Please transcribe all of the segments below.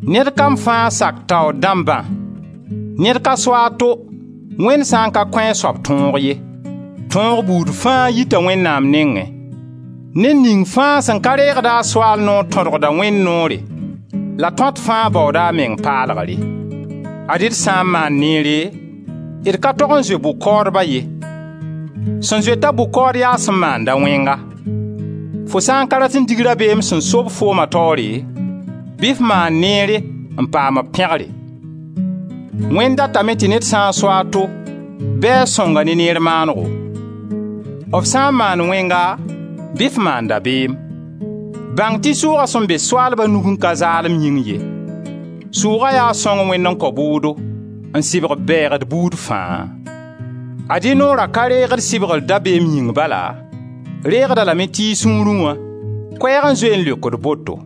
Ned kam fãa sak taoor dãmbã. Ned ka so a to, Wẽnd sã n ka kõ a soab tõog ye. Tõog buud fãa yita Wẽnnaam nengẽ. Ned ning fãa sẽn ka reegd a soaal noor, tõdgda Wẽnd noore la tõat fãa baooda a meng paalgre. Ad-y d sã n maand neere, d ka tog n zoe bʋ-kaoodba ye; sẽn zoet-a bʋ-kaood yaa sẽn maanda wẽnga; fo sã n ka rat n dig rabeem sẽn so-b fooma taoore, bɩ f maan neere n paam b pẽgre. Wẽnd datame tɩ ned sã n so a to bɩ a sõng-a ne neer maanego; f sã n maand wẽnga bɩ f maan dabeem; bãng tɩ sʋʋga sẽn be soaalba nugẽ ka zaalem yĩng ye; sʋʋga yaa sõng Wẽnd n kao bʋʋdo, n sɩbg bɛɛgd buud fãa. Ad-y noora ka reegd sɩbgr dabeem yĩng bala, reegd-a lame tɩ y sũurẽ wã, koɛɛg n zoe n leokd boto.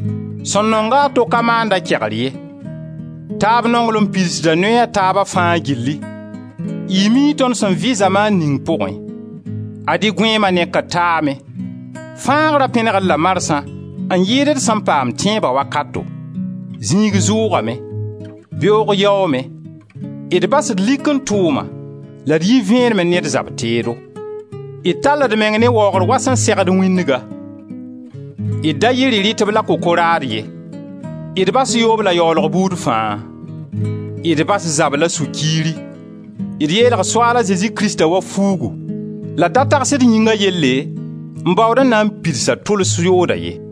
Sẽn nonga a to ka maand-a kegr ye. Taab nonglem pidsda noɛ a taaba fãa gilli. Y mii tõnd sẽn vɩ zamaan ning pʋgẽ. Ad-y gõeema nekr taame, fãagra pẽneg-d la marsã n yɩɩd d sẽn paam tẽeba wakato. Zĩig zʋʋgame. Beoog yaoome. D bas d likẽ tʋʋma la d yi vẽenemẽ ne d zab teedo. D tall d meng ne waoogr wa sẽn segd wĩndga. D da yɩ rɩ-rɩtb la kokoraad ye. D bas yoob la yaoolg buud fãa. D bas zab la sũ-kiiri. D yeelg Soaal a Zezi Krista wa fuugu la d da tags d yĩngã yelle n baood n na n pids a tʋls yooda ye.